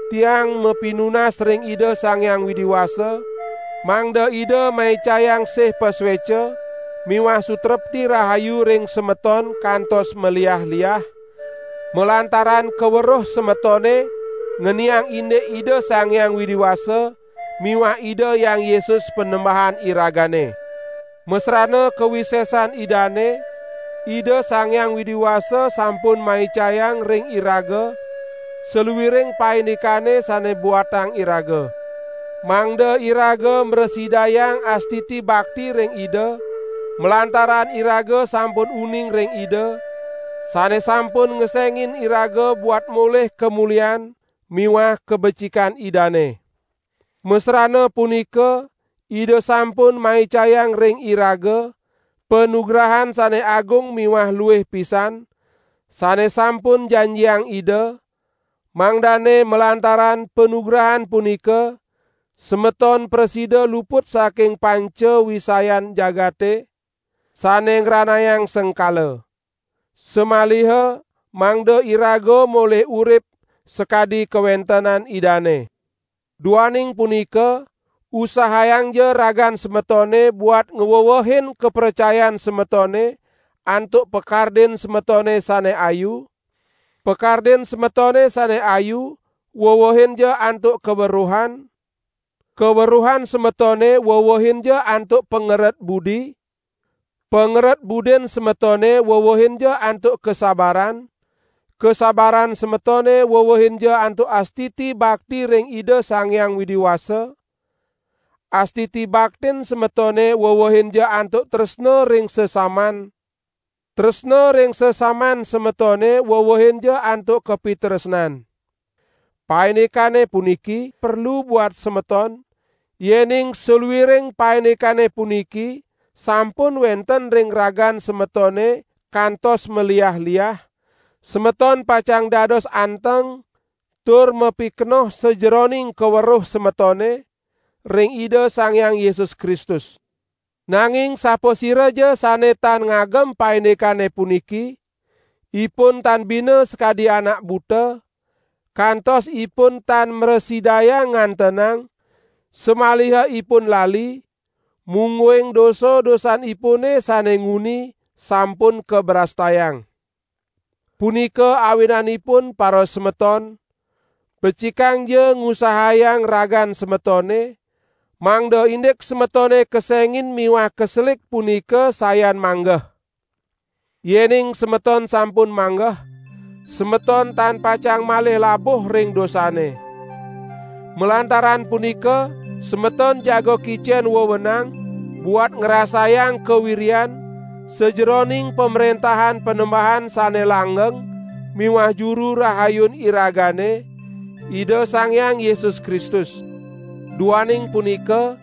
Tiang mapinunas ring Ida Sang Hyang Widi Wasa, mangda Ida maicayang sih pasueca miwah sutrepti rahayu ring semeton kantos maliah-liah, malantaran kaweruh semetone ngeniang indik Ida Sang Hyang Widi Wasa miwah Ida Hyang Yesus Panembahan iragane. Masrana kawisesan Idane, Ida Sang Hyang Widi Wasa sampun maicayang ring iraga saluiring paindikan sane buatang iraga, mangda iraga mrasidayang astiti bakti ring Ida, malantaran iraga sampun uning ring Ida, sane sampun ngesengin iraga buat molih kamulian miwah kabecikan Idane. Masrana punika Ida sampun maicayang ring iraga panugrahan sane agung miwah luih pisan, sane sampun janjiang Ida, mangdane malantaran panugrahan punika semeton prasida luput saking panca wisayan jagate, sane ngranayang sengkala. Samaliha mangda iraga molih urip sakadi kawentenan Idane. Duaning punika usahayangja ragan semetone buat ngwewehin kapracayan semetone antuk pakardin semetone sane ayu; pakardin semetone sane ayu wewehinja antuk kaweruhan; kaweruhan semetone wewehinja antuk pangeret budi; pangeret budin semetone wewehinja antuk kasabaran; kasabaran semetone wewehinja antuk astiti bakti ring Ida Sang Hyang Widi Wasa; astiti baktin semetone wewehinja antuk tresna ring sesaman; tresna ring sesaman semetone wewehinja antuk kapitresnan. Paindikane puniki perlu buat semeton; yening saluiring paindikane puniki sampun wenten ring ragan semetone kantos maliah-liah, semeton pacang dados anteng tur mapikenoh sajeroning kaweruh semetone ring Ida Sang Hyang Yesus Kristus. Nanging sapasiraja sane tan ngagem paindikane puniki, ipun tan bina sakadi anak buta, kantos ipun tan mrasidayang ngantenang, samaliha ipun lali, mungguing dosa-dosanipune sane nguni sampun kabrastayang. Punika awinanipun parasemeton, becikangja ngusahayang ragan semetone, mangda indik semetone kesengin miwah kaselik punika sayan manggeh. Yening semeton sampun manggeh, semeton tan pacang malih labuh ring dosane. Malantaran punika semeton jaga kicen wewenang buat ngrasayang kawiryan sajeroning Pamrentahan Panembahan sane langgeng miwah Juru Rahayun iragane, Ida Sang Hyang Yesus Kristus. Duaning punika,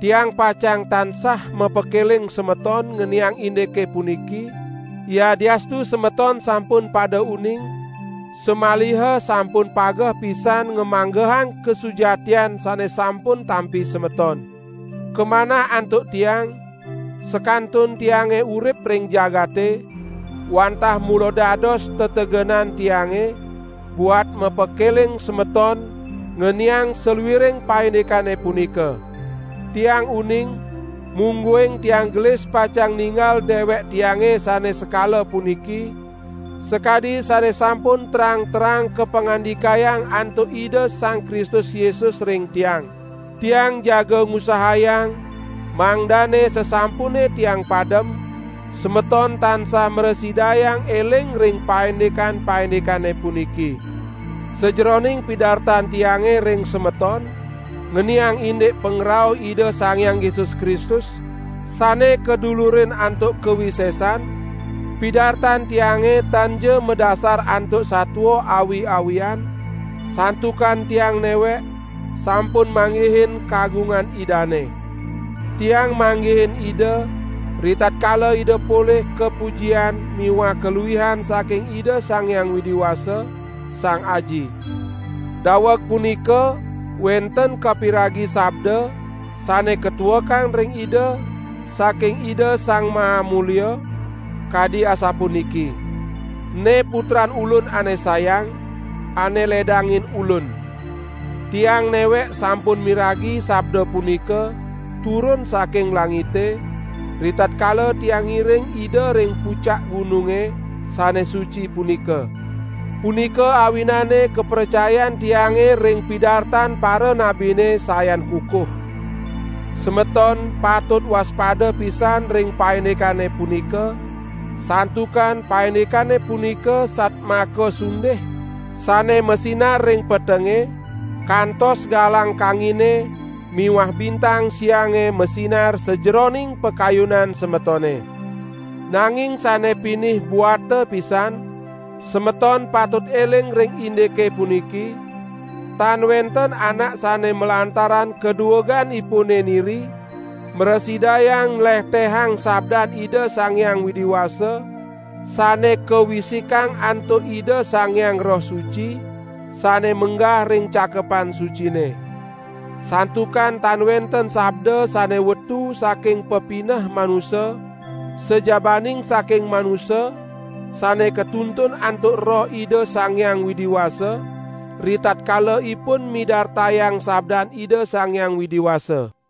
tiang pacang tansah mapakeling semeton ngeniang indike puniki, yadiastu semeton sampun pada uning, samaliha sampun pageh pisan ngamanggehang kasujatian sane sampun tampi semeton. Kamanah antuk tiang, sakantun tiange urip ring jagate, wantah mula dados tetegenan tiange buat mapakeling semeton ngeniang saluiring paindikane punika. Tiang uning, mungguing tiang gelis pacang ninggal dewek tiange sane sekala puniki, sakadi sane sampun terang-terang kapangandikayang antuk Ida Sang Kristus Yesus ring tiang. Tiang jaga ngusahayang mangdane sasampune tiang padem, semeton tansah mrasidayang eling ring paindik-paindikane puniki. Sajeroning pidartan tiange ring semeton ngeniang indik pangrauh Ida Sang Hyang Yesus Kristus sane kadulurin antuk kawisesan, pidartan tiange tanja madasar antuk satua awi-awian, santukan tiang newek sampun manggihin kagungan Idane. Tiang manggihin Ida, ritatkala Ida polih kapujian miwah kaluihan saking Ida Sang Hyang Widi Wasa, Sang Aji. Daweg punika wenten kapiragi sabda sane katuekang ring Ida saking Ida Sang Maha Mulia, kadi asapuniki: "Ene Putran Ulun ane sayang, ane ledangin Ulun." Tiang newek sampun miragi sabda punika turun saking langite, ritatkala tiang ngiring Ida ring pucak gununge sane suci punika. Punika awinane kapracayan tiange ring pidartan paranabine sayan kukuh. Semeton patut waspada pisan ring paindikane punika, santukan paindikane punika satmaka sundih sane masinar ring petenge, kantos galang kangine miwah bintang siange masinar sajeroning pakayunan semetone. Nanging sane pinih buata pisan, semeton patut eling ring indike puniki: Tan wenten anak sane malantaran kadueganipune niri mrasidayang nlehtehang sabdan Ida Sang Hyang Widi Wasa sane kawisikang antuk Ida Sang Hyang Roh Suci sane menggah ring Cakepan Sucine. Santukan tan wenten sabda sane wetu saking pepineh manusa, sajabaning saking manusa sane katuntun antuk Roh Ida Sang Hyang Widi Wasa, ritatkala ipun midartayang sabdan Ida Sang Hyang Widi Wasa.